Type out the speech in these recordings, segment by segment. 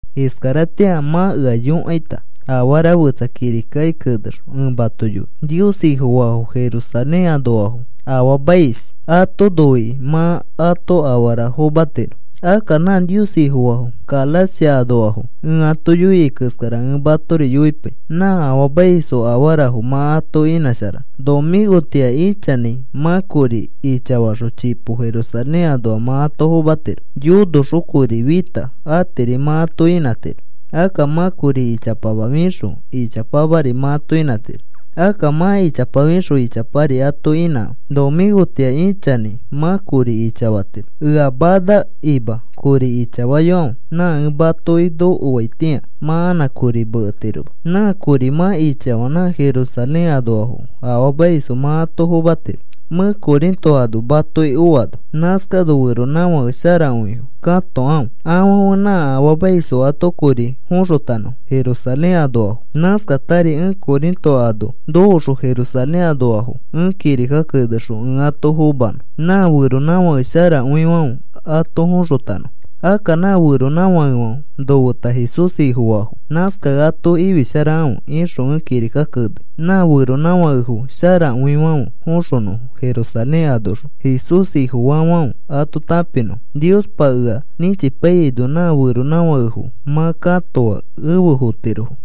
Iskaratĩa mã ea yõkaita, afara fetsa kirikaki kenexõ ẽ mato yoi. Nios Ifofaafo Jerusalén anoafo afaamais. Ato noikĩ mã ato afara fomatiro. Akka nã Nios Ifofaafo Galacia anoafo ẽ ato yoia keskara ẽ matori yoipai nã afaamaisfo afarafo mã ato inãsharanõ. Nomĩkotĩa ichanãi mã kori ichafaxõ chipo Jerusalén anoa mã ato fomatiro. Yonoxõ kori fĩta atiri mã ato inãtiro. Akka mã kori ichapama fixõ ichapamari mã ato inãtiro. Akka mã ichapa fixõ ichapari ato inãkãfe. Nomĩkotĩa ichanãi mã kori ichafatiro, ea manakima kori ichafayokãfe. Nã ẽ matoki nokoaitĩa mã anã kori meketiroma. Nã kori mã ichafaa nã Jerusalén anoafo afaamaisfo mã ato fomatiro mẽ Corinto ano matoki oano. Nãskano feronãfake sharakõifo katokãfe afãfe nã afaamaisfo ato kori foxotanõfo Jerusalén anoafo. Nãskatari ẽ Corinto ano nokoxõ Jerusalén anoafo ẽ kirika kenexõ ẽ ato fomanõ. Nã feronãfake sharakõifãfe ato foxotanõfo. Akka nã feronãfakefãfe nofeta Jesús Ifofaafo. Nãskakẽ ato ifisharakãfe ixõ ẽ kirika kenei nã feronãfakefo sharakõifãfe foxonõfo Jerusalén anoxõ Jesús Ifofaafãfe ato tãpinõfo. Niospa ea nĩchipaiyaino nã feronãfakefo mã katoa efe fotirofo.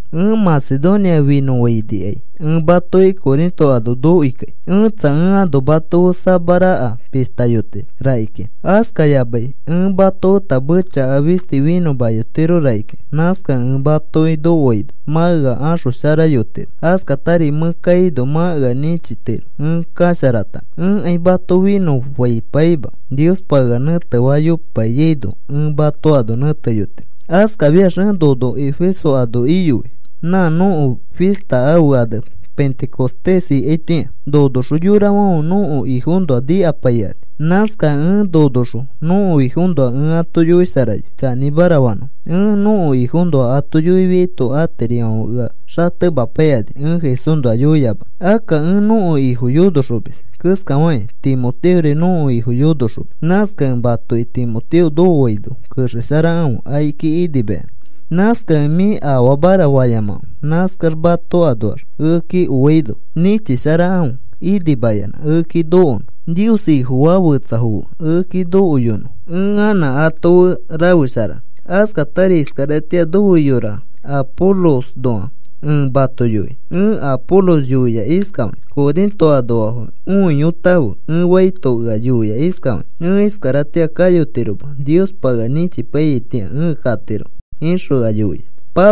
Ẽ Macedonia finõfainikai ẽ matoki Corinto ano nokoikai. Ẽtsa, ẽ ano mato fe samaraka pishtayotiro rakikĩa. Askayamai ẽ mato feta mechaka fisti finõyotiro rakikĩa. Nãskakẽ ẽ matoki nokoaino mã ea axosharayotiro. Askatari mẽ kaino mã ea nĩchitiro ẽ kasharatanõ. Ẽkai mato finõfaipaima. Niospa ea nẽtefayopaiyaino ẽ mato ano nẽteyotiro. Askafiax ẽ nono Efeso ano iyoi nã nõko fista ãfe ane Pentecostés ikaitĩa. Nonoxõ yorafãfe nõko Ifoõnoa nikapaikani. Nãskakẽ ẽ nonoxõ nõko Ifoõnoa ẽ ato yoisharayoi chanĩmara fanõfo. Ẽ nõko Ifoõnoa ato yoifiaito atirifãfe ea xatemapaikani ẽ Jesúsnoa yoiyamanõ. Akka ẽ nõko Ifo yonoxomis keskafakĩ Timoteori nõko Ifo yonoxomis. Nãskakẽ matoki Timoteo nokoaino kexesharakãfe akiki inimayanã. Nãskakẽ, “Mĩ afaamara,” fayamakãfe. Nãskax mato anoax ekeki oaino nĩchisharakãfe inimayanã ekeki nokonõ. Nios Ifofaa fetsafo fe ekeki nokoyonõ ẽ anã ato fe rafesharanõ. Askatari iskaratĩa nofe yora Apolosõnoa ẽ mato yoi. Ẽ Apolos yoia iskafakĩ: “Corinto anoafo õiyotãfe,” ẽ faito ea yoia iskafakĩ: “Ẽ iskaratĩa kayotiroma. Niospa ea nĩchipaiyaitĩa ẽ katiro,” ixõ ea yoia.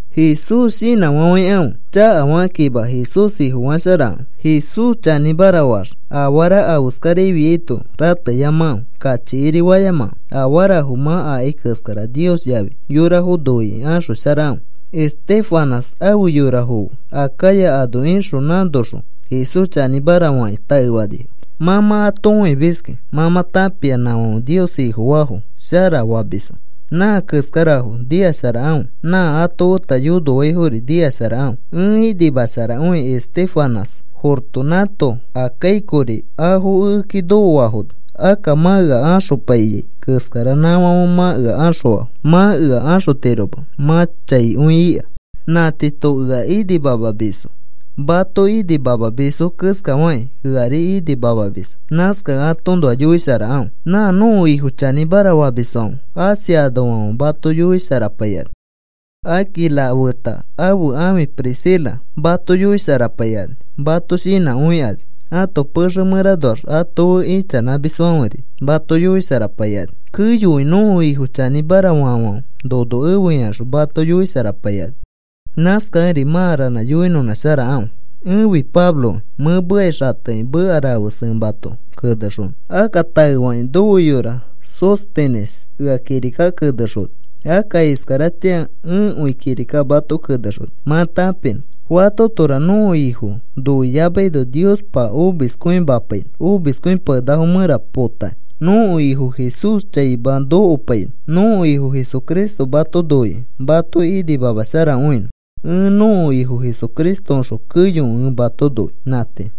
Jesús shinãfafãikãfe chakafakakĩma. Jesús Ifofasharakãfe. Jesús chanĩmara faax afara afeskarafiaito rateyamakãfe. Kachikirifayamakãfe. Afarafo mã akai keskara Nios yafi yorafo noikĩ axosharakãfe. Estéfanas afe yorafo fe Acaya ano ixõ nãnoxõ Jesús chanĩmara fakĩ taefanifo. Mã mã ato õimiskĩ. Mã mã tãpia nãfãfe Nios Ifofaafo sharafamisfo. Nã keskarafo nikasharakãfe. Nã ato feta yonoaifori nikasharakãfe. Ẽ inimasharakõi Estéfanas, Fortunato, Acaicori afo ekeki nokoafono. Akka mã ea axopaiyai keskara nãfãfe mã ea axõafo. Mã ea axotiroma mã chaikõi ika. Nã tiito ea inimamamisfo. Mato inimamamisfo keskafakĩ eari inimamamisfo. Nãskakẽ atoõnoa yoisharakãfe. Nã nõko Ifo chanĩmara famisfãfe Asia anoafãfe mato yoisharapaikani. Aquila feta ãfe ãfi Priscila mato yoisharapaikani. Mato shinãkõikani. Ãto pexe mẽranoax ato fe ichanãmisfãferi mato yoisharapaikani. Keyokõi nõko Ifo chanĩmara faafãfe nono efe ikaxõ mato yoisharapaikani. Nãskakẽri mã ranã yoinõnãsharakãfe. Ẽfi Pabloki mẽ mekai xatekĩ meka rafes ẽ mato kenexonõ. Akka taefakĩ nofe yora Sóstenes ea kirika kenexona. Akka iskaratĩa ẽkõi kirika mato kenexoni mã tãpinõ. Fatotora nõko Ifo noiyamaino Niospa omiskõimapainõ omiskõipakenakafo mẽra potakĩ. Nõko Ifo Jesús chaima nokopainõ. Nõko Ifo Jesucristo mato noikĩ mato inimamasharakõinõ. Ẽ nõko Ifo Jesucristoõxõ keyokõi ẽ mato noi. Nã tii.